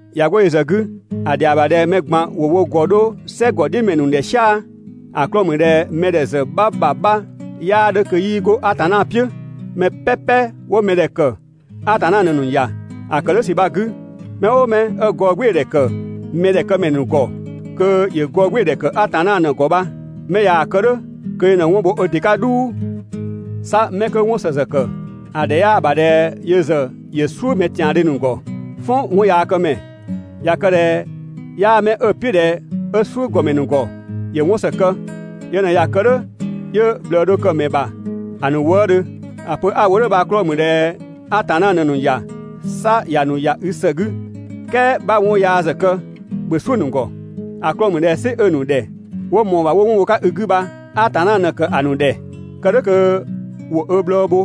꞊Ya 'go yö ‑zë 'gü, ‑a ‑dhɛa ‑bha ꞊dhɛ mɛ ꞊gban ‑wo wo ‑gɔ 'dho "sɛgɔdhiʋ̈mɛ ‑nu ‑dhɛ "sia‑. ‑A 'klɔɔ‑ ‑mü ꞊dhɛ mɛdhɛ ‑zë 'bha ‑bha 'bha 'yaa 'dhö kö 'yii 'go Atanna "piʋ̈. Mɛ "pɛpɛ 'wo mɛdhɛ ‑kë, Atanna ꞊në‑ ‑nu ‑ya. ‑A ‑kë "dhʋ̈ ‑sü bha‑ 'gü, mɛ "ʋʋ mɛ 'ö gɔɔgbɩɩdhɛ ‑kë mɛdhɛkëmɛ ‑nu ‑gɔ, kö ‑yö gɔɔgbɩɩdhɛ ‑kë Atanna ꞊në‑ ‑gɔ bha. 'Mɛ ꞊yaa‑ kë "dhʋ̈, kö yö ꞊në 'wɔn bho ö ‑dɩ 'ka "dhuu. 'Sa 'mɛ 'kö 'wɔn ‑së ‑zë ‑kë, ‑a ‑dhɛ 'yaa‑ ‑bha ꞊dhɛ yö ‑zë ‑yö "suʋ̈ mɛ ‑tiandhö ‑nu ‑gɔ. "Fɔn 'wɔnyaakëmɛ. ꞊Ya kë ꞊dhɛ 'yaa 'mɛ 'ö‑ "piʋ̈ ꞊dhɛ 'ö "suʋ̈ ‑gɔmɛ ‑nu ‑gɔ, ‑yö 'wɔn ‑së kë. Yö ꞊në ꞊ya kë "dhʋ̈ 'yö ꞊bhlëë dho kë‑ ‑mɛ ‑bha ‑a ‑nu wëëdhö. ‑A pö 'a‑ wo "dhʋ̈ bha‑ 'klɔɔ‑ ‑mü ꞊dhɛ Atanna ꞊në‑ ‑nu ‑ya, 'sa ‑ya ‑nu ‑ya i ‑së 'gü. "Kɛɛ 'bha 'wɔn yaa ‑zë kë, ‑bhö "suʋ̈‑ ‑nu ‑gɔ. ‑A 'klɔɔ‑ ‑mü ꞊dhɛ "sɩ 'ö‑ ‑nu ‑dhɛ 'wo ꞊mɔɔ‑ ‑bha 'wo 'wɔn bho‑ 'ka i 'gü ‑bha Atanna ꞊në‑ ‑kë ‑a ‑nu ‑dhɛ, kë "dhʋ̈ kö ‑wo ö bhlɔɔ bho,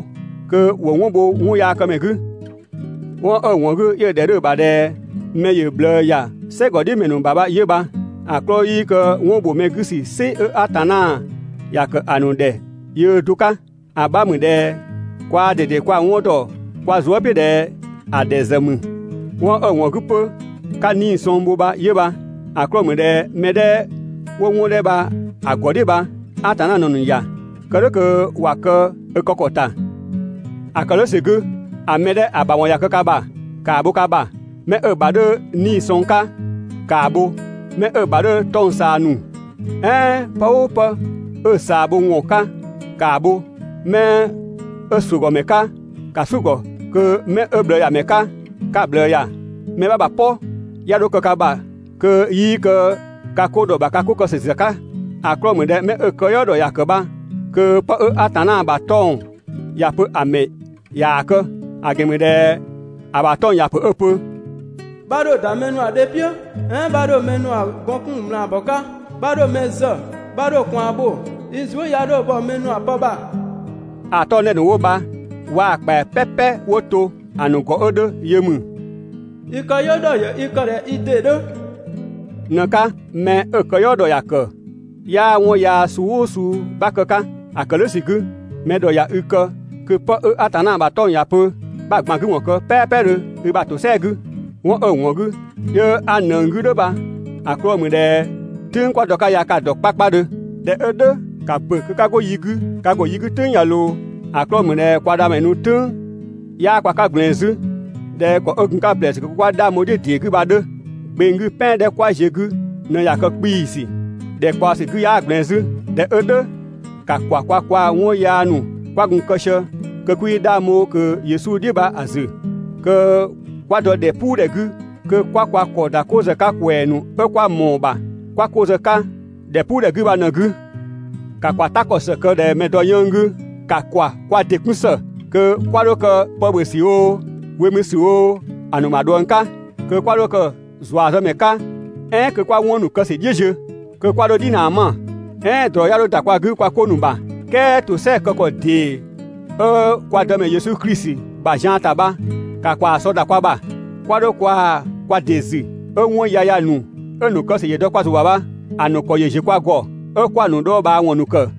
kö ‑wo 'wɔn bho 'wɔnyaakëmɛ 'gü. 'Wɔn 'ö‑ ‑wɔn 'gü 'yö‑ ‑dhɛ 'dhö‑ ‑bha ꞊dhɛ mɛ ‑yö ꞊bhlëë ‑ya "sɛgɔdhiʋ̈mɛ ‑nu ‑bha bha 'yö bha. ‑A 'klɔɔ‑ 'yii kë 'wɔn ‑bho mɛ 'gü ‑sü "sɩ 'ö Atanna ‑ya ‑kë ‑a ‑nu ‑dhɛ bha yöö do‑ 'ka. ‑A 'bha ‑mü ꞊dhɛ kwaa ꞊dede kwa‑ 'wɔn ‑dɔ kwa zuë" "piʋ̈ ꞊dhɛ ‑a ‑dhɛ ‑zë ‑mü. 'Wɔn 'ö‑ ‑wɔn 'gü 'pö 'ka 'nii‑ sɔng bho bha 'yö bha. ‑A 'klɔɔ‑ ‑mü ꞊dhɛ mɛ 'dhɛ 'wo 'wɔn 'dhɛ bha‑ ‑gɔ "dhiʋ̈ bha, Atanna ꞊në‑ ‑nu ‑ya. Kë "dhʋ̈ kö ‑wa kë ö kë ‑kɔ ‑ta. ‑A ‑kë "dhʋ̈ ‑sü 'gü, ‑a mɛ 'dhɛ ‑a ‑bha 'wɔn ꞊ya kë ka ‑bha, ‑kaa bho ka ‑bha. Mɛ 'ö‑ ‑bha 'dhö 'nii‑ sɔng 'ka, ‑kaa bho, mɛ 'ö ‑bha 'dhö 'tɔng‑ ꞊saa ‑nu, "ɛɛn pë "ʋʋ pë 'ö‑ ꞊saa bho ‑wɔn 'ka, ‑kaa bho. Mɛ 'ö ‑suʋ̈gɔmɛ 'ka, ‑ka "suʋ̈‑ ‑gɔ kö mɛ 'ö ꞊bhlëëyamɛ 'ka 'ka‑ ꞊bhlëë ‑ya. Mɛ 'bha ‑bha "pɔ 'ya 'dho kë ka ‑bha kö 'yii kë ka 'ko ‑dhɔ ‑bha ka 'ko kë ‑sü ‑zë 'ka. ‑A 'klɔɔ‑ ‑mü ꞊dhɛ 'mɛ 'ö‑ këyɔɔ ‑dhɔ ‑ya ‑kë bha kö 'pë 'ö Atanna ‑bha 'tɔng‑ ‑ya pö ‑a mɛ ꞊yaa‑ kë. ‑A ‑gɛn ‑mü ꞊dhɛ ‑a ‑bha 'tɔng‑ ‑ya ‑pö 'ö‑ pö: «'Bha 'dho ‑da mɛ ‑nu ‑bha dhe "piʋ̈, "ɛɛn 'bha 'dho mɛ ‑nu ‑bha gɔn 'kun ꞊mlaabɔ 'ka, 'bha 'dho mɛ zë, 'bha 'dho ꞊kwaan bho, i zuë" 'ya 'dho bhɔ mɛ ‑nu ‑bha pë ‑bha.» ‑A 'tɔng‑ 'dhɛ ‑nu 'wo bha waa‑ ‑kpɛa "pɛpɛ 'wo to ‑a ‑nu ‑gɔ 'ö 'dhö yö ‑mü: «I këyɔɔ ‑dhɔ ‑yö i kë ꞊dhɛ i ‑dɩ 'dhö.» ꞊në‑ 'ka. Mɛ 'ö‑ këyɔɔ ‑dhɔ ‑ya ‑kë, 'yaa 'wɔn yaa suu "ʋʋ suu 'bha kë‑ 'ka. ‑A ‑kë "dhʋ̈ ‑sü 'gü, mɛ ‑dhɔ ꞊ya i kë kö pë 'ö Atanna ‑bha 'tɔng‑ ‑ya pö 'bha‑ ꞊gban 'gü ‑wɔn kë "pɛɛpɛdhö i ‑bha ‑tosɛa 'gü. 'Wɔn 'ö‑ ‑wɔn 'gü, 'yö 'a ꞊nëng 'gü "dhʋ̈ bha‑ 'klɔɔ‑ ‑mü ꞊dhɛ "tʋ̈ng kwa dɔ‑ 'ka ya ka‑ dɔ 'kpakpadhö. ꞊Dhɛ 'ö "dhʋ̈, ‑ka ‑bö kö 'ka 'go yi 'gü, ka ‑go yi 'gü "tʋ̈ng ꞊ya ꞊loo. ‑A 'klɔɔ‑ ‑mü ꞊dhɛ kwa dhamɛ nu "tʋ̈ng 'yaa kwa 'ka ꞊gblɛɛn 'zü ꞊dhɛ ‑kɔ 'ö gun‑ 'ka ‑blɛɛsü kö 'kwa 'dhang bho‑ "dhiʋ̈ ‑dee 'gü bha‑ 'dhö. Gbeng 'gü "pɛan 'dhɛ 'kwa ziö‑ 'gü ꞊në ꞊ya kë 'kpiisü. ‑Dhɛkpaɔ ‑sü 'gü 'yaa ꞊gblɛɛn 'zü. ꞊Dhɛ 'ö "dhʋ̈, ‑ka ‑kwa kwa kwaa‑ 'wɔn yaa ‑nu 'kwa gun‑ kë sië kö 'kwii 'dhang bho ꞊kö Yesu "dhiʋ̈ bha‑ ‑zü, kö 'kwa dɔ ‑dhɛpuudhɛ 'gü kö 'kwa kwa ‑kɔ ‑da 'ko ‑zë 'ka ‑kwɛɛ ‑nu 'ö 'kwa ꞊mɔɔ‑ ‑bha 'kwa 'ko zë‑ 'ka ‑dhɛpuudhɛ 'gü bha‑ 'gü. ‑Ka ‑kwa "ta ‑kɔ ‑së kë ꞊dhɛ mɛ‑ dɔ 'yënng‑ 'gü. ‑Ka ‑kwa kwa ‑dɩ 'kun ‑së kö 'kwa 'dho kë pë ‑bhö ‑sü oo, we mü ‑sü oo, ‑a ‑nu ‑bha ꞊dhuëng 'ka. Kö 'kwa 'dho kë ‑zuazëmɛ 'ka, "ɛɛn kö 'kwa 'wɔn ‑nu kë ‑sü "dhiʋ̈ ziö. Kö 'kwa 'dho "dhinaa 'ma, "ɛɛn ꞊drɔ 'ya 'dho ‑da kwa 'gü kwa 'ko ‑nu ‑bha. "Kɛɛ ‑tosɛa kë ‑kɔ ‑dee 'ö kwa Dëmɛ Yesu Klisi ‑bha ‑zian ‑ta bha, ‑ka ‑kwaa sɔ ‑da kwa ‑bha. 'Kwa 'dho kwaa‑ kwa ‑dɩ ‑zü 'ö 'wɔn yaya ‑nu 'ö‑ ‑nu kë ‑sü ‑yö dɔ kwa ‑zʋ ‑bha bha ‑a ‑nu ‑kɔ ‑yö ‑ziö kwa ‑gɔ 'ö 'kwa‑ ‑nu dhɔɔbhaawɔn ‑nu ‑kë.